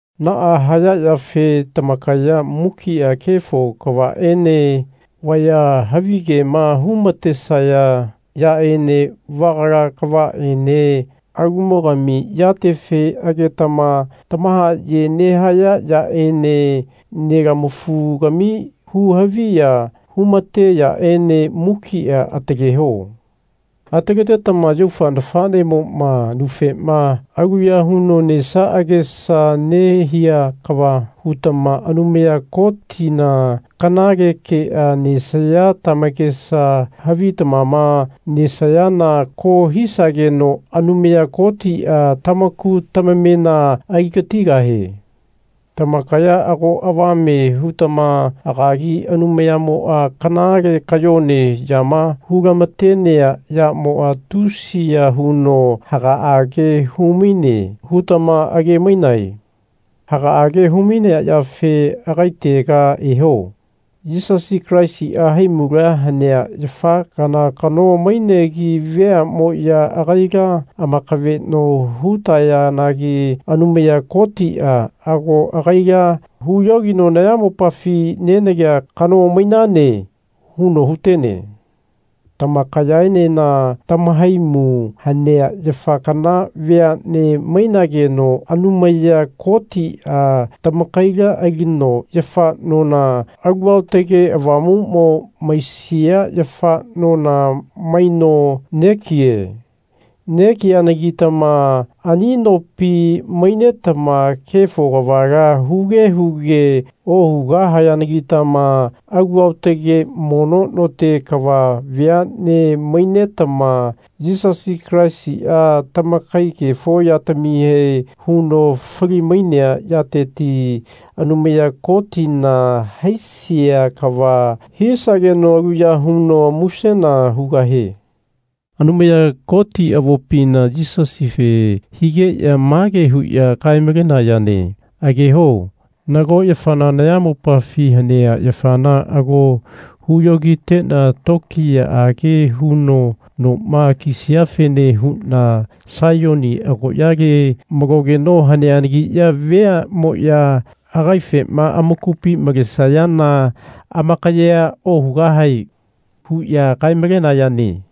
Naa haya yafe tamakaya mukia kefo kavaene, vaya havi kema hu-matesaya yaene, vagala kavaene, alumogami yatefe agetama tamahaye nehaya yaene, nelamafu-gami hu-haviya humate yaene mukia ataleho. Ataletetama yaufa nafanemoma nufema aluya huno nesia agesa nehia kava hutama Anumaya Kotina kanale kea nesaya tamakesa havitamama nesayana ko hisageno Anumaya Kotia tamaku tamamena aligatigahie. Tamakaya ago avame hutama agagi Anumayamoa kanale kayone yama hu-lamatenea yamoa tusiya huno hagaage humaine hutama age-mainae. Hagaage humainea yafe agaitega eho. Yisasi Kalaisia haimula hanea yafa kana kano mainegi veanemoya agaila amakaveno hutayanagi Anumaya Kotia ago agaila huyogino Nayamopafi nenagea kano mainane. huno hutene. Tamakayaenena tamahaimu hanea yafa kana veane mainageno Anumaya Kotia tamakaila alino yafa nona Alu Aotage Avamumo maisia yafa nona maino negie. Negianagitama ani nopi mainetama kefo kavala huge huge ohugahayanagitama alu aotage mono note kava veane mainetama Yisasi Kalaisia tamakai kefo yatamihe huno fali-mainea yateti Anumaya Kotina haisia kava hisageno aluya huno musena hugahie. Anumaya Kotia avopina Yisasife higeya mage huya kae-malenayane Ageho nago yafana nayamopafi hanea yafana ago huyogitena tokiyaage huno noma kisiafene huna Saiyoni agoyale malogeno haneanagiya veamoya agaifema amakupi malesayana amakayea ohugahae. huya kae-malenayane.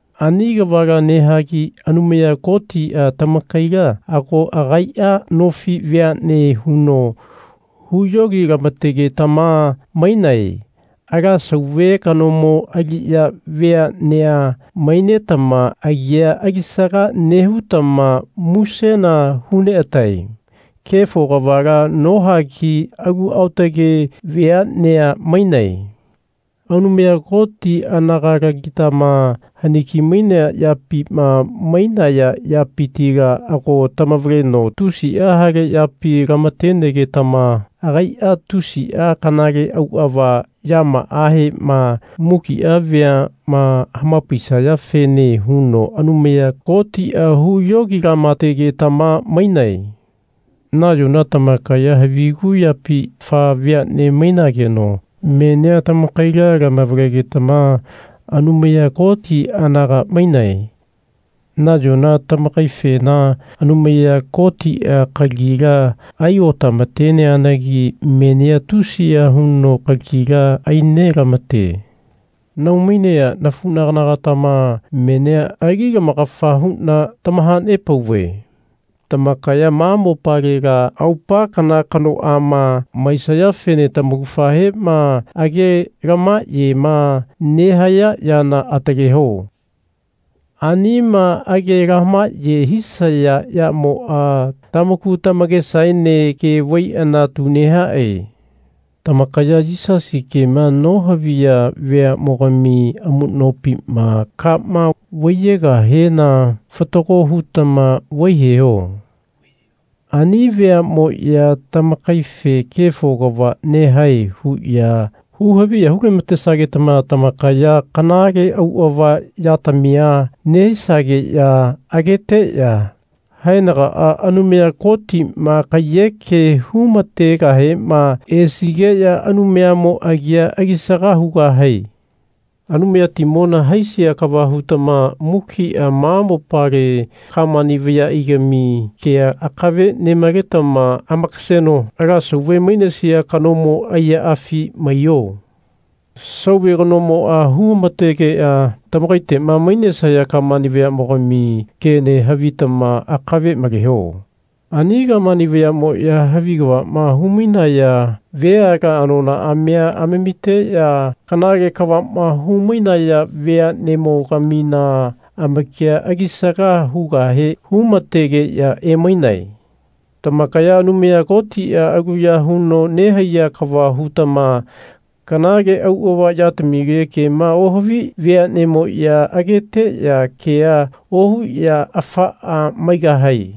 Ani kavala nehagi Anumaya Kotia tamakaila ago agaia nofi veane huno huyogi-lamategetama mainae. Ala Sauve kanomo aliya veanea mainetama agia alisaga nehutama musena hu neatae. Kefo kavala nohagi alu aotage veanea mainae. Anumaya Koti anagalagitama haniki mainea yapima mainaya yapitila ago tamavaleno tusia hale yapi lamatenegetama agaia tusia kanale auava yamaahema mukia veama hamapaisayafene huno Anumaya Kotia huyogi-lamategetama mainae. Nayona tamakaya havigu yapi afa veane mainageno menia tamakaila tamavalegetama Anumaya Koti anaga mainae. Nayona tamakaifena Anumaya Kotia kalagila ai otamateneanagi menia tusiya huno kalagila ai nelamate. Nahau-mainea nafunagana-gatama menia ali lamakafa huna tamahanepauve tamakaya ma mopalela aupa kana kanoama maisayafene tamaugafahema age lamahayema nehaya yana ataleho. Anima age lamahaye hisaya yamoa tamaku tamakesaene ke vaiana tu nehae. Tamakaya Yisasi kema nohaviya veamogami amunopima kama vaiyegahena fatago hutama vaiyeho. Ani veamoya tamakaife Kefo kava nehae. huya hu-haviya hu-lamatesagetama tamakaya kanale auava yatamia nehisageya ageteya haenagaa Anumaya Kotima kaiyeke hu-mategahema esigeya Anumayamo agia alisaga hugahae. Anumayatimona haisia kava hutama mukia ma mopale Kamani vayaigami kea akave nemaletama amakaseno ala sauve mainesia kanomo aiyaafi maiho. Sauve kanomoa hu-mategeya tamakaitema mainesaya Kamani vayamogami kene havitama akave maleho. Ani Kamani vayamoya havi kavama humainaya veala anonaamia amamiteya kanale kavama humainaya veanemo-gamina amakia alisaga hugahe hu-mategeya emainae. Tamakaya Anumaya Kotia aluya huno nehaiya kava hutama kanale auava yatamile kema ohavi veanemoya ageteya kea ohuya afaa maigahae.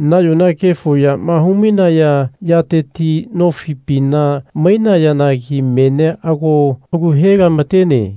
Nayona kefo yama hu-mainaya yateti nofipina mainayanagi menia ago kalu he-lamatene.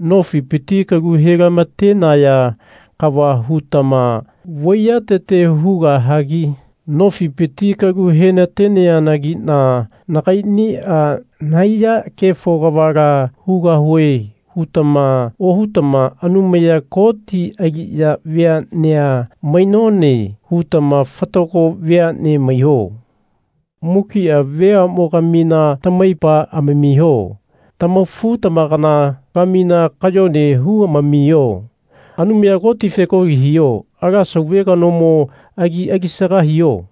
Nofipiti kalu he-lamatenaya kava hutama vaiyatete hugahagi Nofipiti kalu henateneanagina nagainia nahaiya kefo kavala hugahue. hutama ohutama Anumaya Koti aliya veanea mainone. hutama fatago veane maiho. Mukia veamogamina tamaipa amamiho. Tamafu-tamakana-gamina kayone humamiho. Anumaya Kotife kolia hiho. Ala sauve kanomo agi alisaga hiho.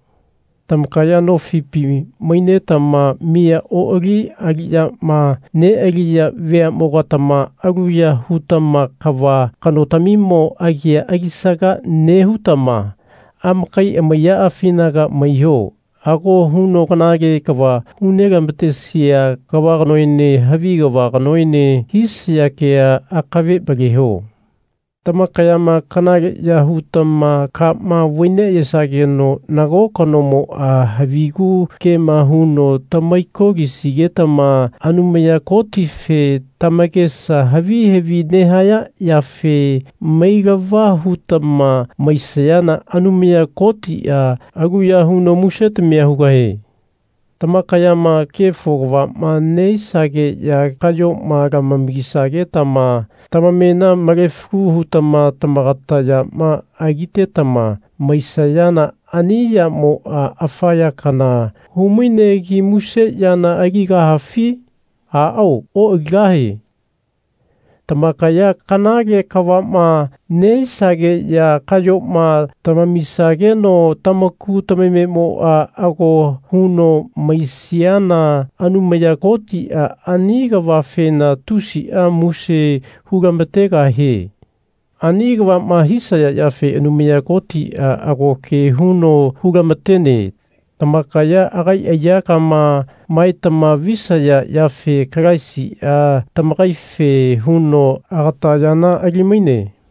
Tamakaya nofipi mainetama miya oali aliyama nealiya veamogatama aluya hutama kava kanotamimo agia alisaga nehutama amakai amaiyaafinaga maiho. Ako huno kanale kava hu nelamatesia kava kanoene havi kava kanoene hisaya kea akave maleho. Tamakayama kanale ya hutama kama vai neayesageno nago kanomoa havigu kema huno tamaiko-lisigetama Anumaya Kotife tamakesa havi havi nehaya yafe mailava hutama maisayana Anumaya Kotia aluya huno musetamia hugahie. Tamakayama kefo kavama nehisageya kayoma lamamisagetama tamamena malefalu hutama tamagata yama alitetama maisayana ani yamoa afa ya kana hu-mainegi muse yana aligahafi? Aao oaligahae. Tamakaya kanale kavama nehisageya kayoma tamamisageno tamaku tamamemoa ako huno maisiana Anumaya Kotia ani kavafena tusia muse hu-lamategahie. Ani kavama hisaya yafe Anumaya Kotia ago ke huno hu-lamatene. Tamakaya agai aiyakama maetama visaya yafe Kalaisia tamakaife huno agata yana ali-maine.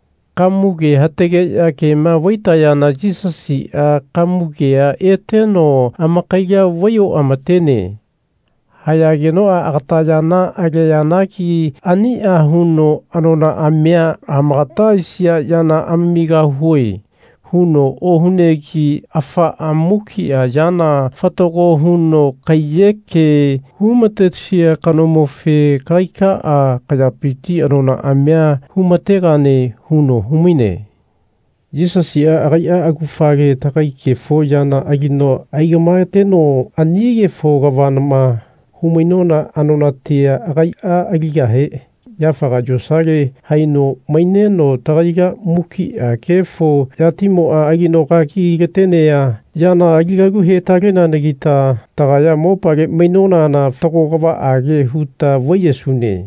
Kamuge hatageya kema vaitayana Yisasia kamugea eteno amakaila vai oamatene. Hayagenoa agata yana aleanagi ania huno Anonaamia amakata aisia yana amamigahue. huno ohunegi afaa mukia yana fatago huno kaiyeke hu-matesia kanomofe Kagaikaa kayapiti anonaamia hu-mategane. huno humaine. Yisasia agaia augafale tagai kefo yana alino aigamaeteno ani kefo kavama hu-mainona anonatia agaia aligahe yafaga yosalela haino maineno tagaila mukia kefo yatimoa alino aigagi-latenea yana ali-galu he-taleneanagita tagaya mopale mainonana fatago kavaage huta vaiyesune.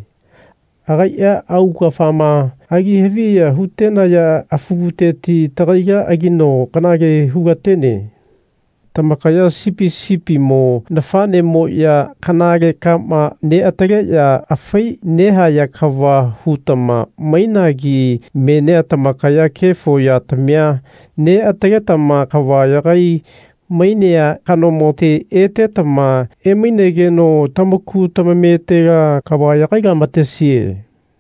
Agaia augafama ali haviya hutenaya afuguteti tagaila alino kanale hu-latene. Tamakaya sipi sipimo nafanemoya kanale kama neataleya afai nehaya kava hutama mainagi menia tamakaya kefo yatamia neataletama kava yagai-mainea kanomote etetama emainegeno tamaku tamametela kava yagai-lamatesie.